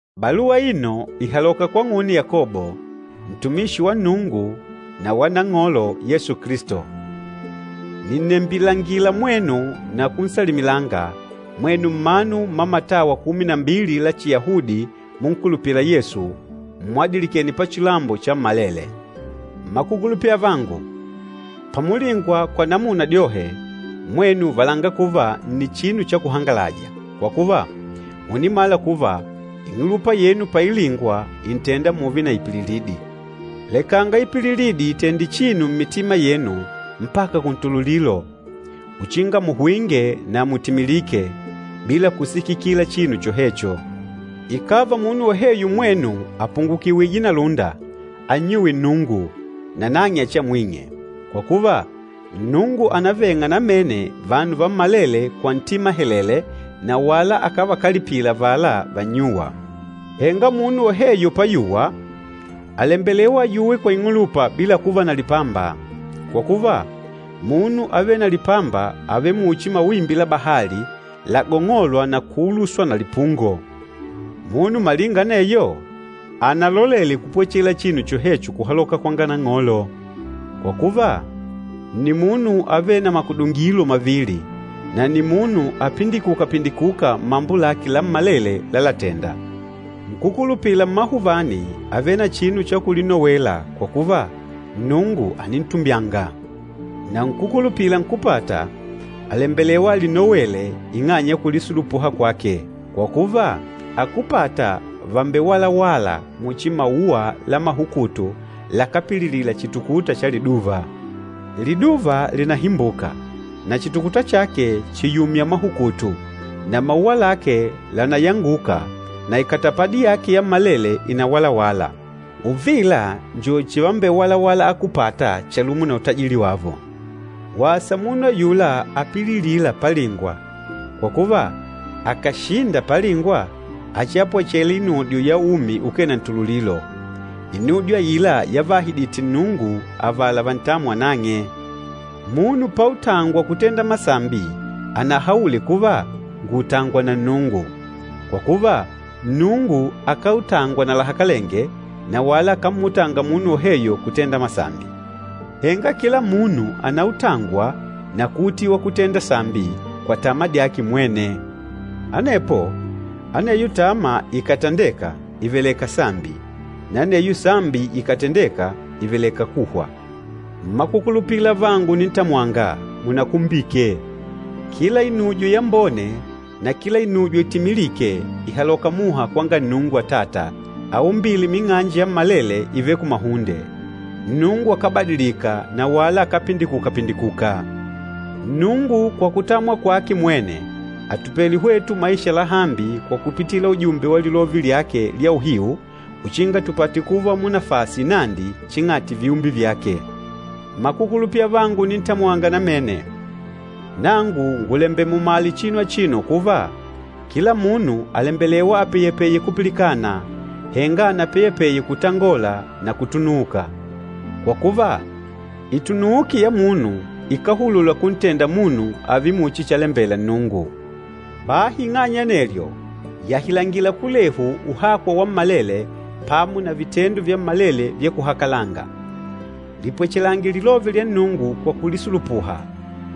Baluwa aino ìhaloka kwang'une Yakobo, ntumishi wa Nnungu na wa Nang'olo Yesu Kilisto. Nìnnembilangila mwenu na kunsalimilanga, mwenu mmanu mma matawa kumi na mbili la chiyahudi munkulupîla Yesu, mmwadilikêne pachilambo chammalele. Mmakukulupila avangu, pamulingwa kwa namuna dyohe, mwenu valanga kuva nni chinu cha kuhangalaja, kwa kuva, mùnimala kuva ing'ulupa yenu pailingwa ìntenda mùùve na ipililidi. Lekanga ipililidi itende chinu mmitima yenu mpaka kuntululilo, uchinga muhwinge na mutimilike, bila kusikikila chinu chohecho. Ikàva munu woheyo mmwenu àpungukiwije na lúnda, annyuwe Nnungu, nanang'e achiamwing'e. Kwa kuva, Nnungu ànaveng'a namene vanu vammalele kwa ntima helele na wala akávakalipila avala vannyûwa. Henga munu woheyo payuwa, àlembelewa ayuwe kwa ing'ulupa bila kuva na lipamba. Kwa kuva, munu avêle na lipamba àvele muchi mawimbi la bahali, lagong'olwa na kuuluswa na lipungo. Munu malinga aneyo, analolele kupwechela chinu chohecho kuhaloka kwanga Nang'olo. Kwa kuva, nni munu avêle na makudungilo mavili, na nni munu apindikuka-pindikuka mmambo lake lammalele lalatenda. Nkúkulupila mmahuvani àvele na chinu cha kulinowela kwa kuva, Nnungu ànintumbyanga. Na nkúkulupila nkúpata àlembelewa alinowele ing'anya ya kulisulupuha kwake. Kwa kuva, akúpata vàmbewalawala muchi mauwa la mahukutu lakápililila chitukuta cha liduva. Liduva lìnahimbuka na chitukuta chake chìyumya mahukutu, na mauwa lake lànayanguka na ikatapadi yake yammalele ìnawalawala. Uvila njo chivambewalawala akúpata chalumo na utajili wavo. Wasa munu ayula apililîla palingwa, kwa kuva, akàshinda palingwa, achiapwechele inudyo ya umi ukee na ntululilo, inudyo aila yavaahidite Nnungu avala vantâmwa nang'e. Munu pautangwa kutenda masambi anahaule kuva, “Ngùutangwa na Nnungu.” Kwa kuva, Nnungu akáutangwa na lahakalenge, na wala akámmutanga munu woheyo kutenda masambi. Henga kila munu ànautangwa na kuutiwa kutenda sambi kwa tama dyake mwene. Anepo aneyo tama ikàtandeka, ìveleka sambi, na aneyo sambi ikàtandeka ìveleka kuhwa. Mmakukulupila avangu unintamwanga, munakumbike! Kila inujo yambone na kila inujo itimilîke ìhaloka muha kwanga Nnungu Atata, aumbîle ming'anji yammalele ivêle kumahunde. Nnungu akábadilika na wala akápindikuka-pindikuka. Nnungu kwa kutamwa kwake mwene àtupele hwetu maisha lahambi kwa kupitila ujumbe wa lilove lyake lya uhiu uchinga tupate kuva munafasi inandi ching'ati viumbe vyake. Mmakukulupila avangu unintamwanga namene, nangu ngùlembela mumale chinu achino kuva, kila munu àlembelewa apeyepeye kupilikana, henga anapeyepeye kutangola na kutunuuka. Kwa kuva, itunuuki ya munu ikáhulula kuntenda munu ààve muchi chalembela Nnungu. Bahi ing'anya ya anelyo, yahilangila kulehu uhakwa wammalele pamo na vitendo vyammalele vya kuhakalanga. Lipwechelange lilove lya Nnungu kwa kulisulupuha,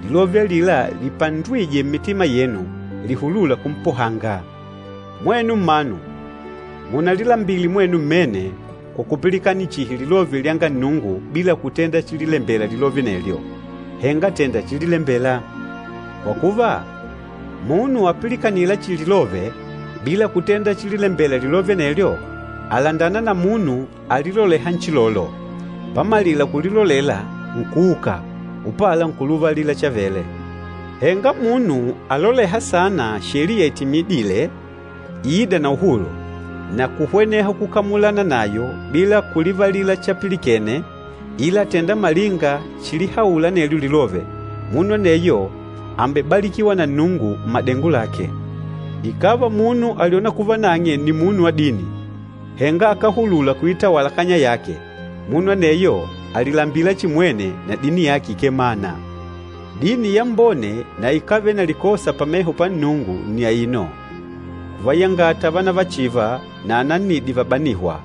lilove alila lipandwîje mmitima yenu, lihulûla kumpohanga. Mwenu mmanu, munalilambile mwenu mmene kwa kupilikanila chihi lilove lyanga Nnungu bila kutenda chililembela lilove anelyo, henga tènda chililembela. Kwa kuva, munu apilikanîla chihi lilove bila kutenda chililembela lilove anelyo, àlandana na munu aliloleha nchilolo, pamalila kulilolela nkuuka, upala nkulivalila chavele. Henga munu alolêha saana sheliya itimidîle, iîda na uhulu, na kuhweneha kukamulana nayo bila kulivalila chapilikene ila àtenda malinga chilihaula anelyo lilove, munu aneyo àmbebalikiwa na Nnungu mmadengo lake. Ikàva munu àlyona kuva nang'e nni munu wa dini, henga akáhulula kuitawala kanya yake, munu aneyo àlilambila chihi mwene na dini yake ikemana. Dini yambone na ikávele na likosa pameho pa Nnungu nni aino, kuvayangata vanavachiva na anannidi vabanîhwa,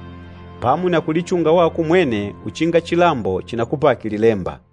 pamo na kulichunga wako umwene uchinga chilambo chinakupake lilemba.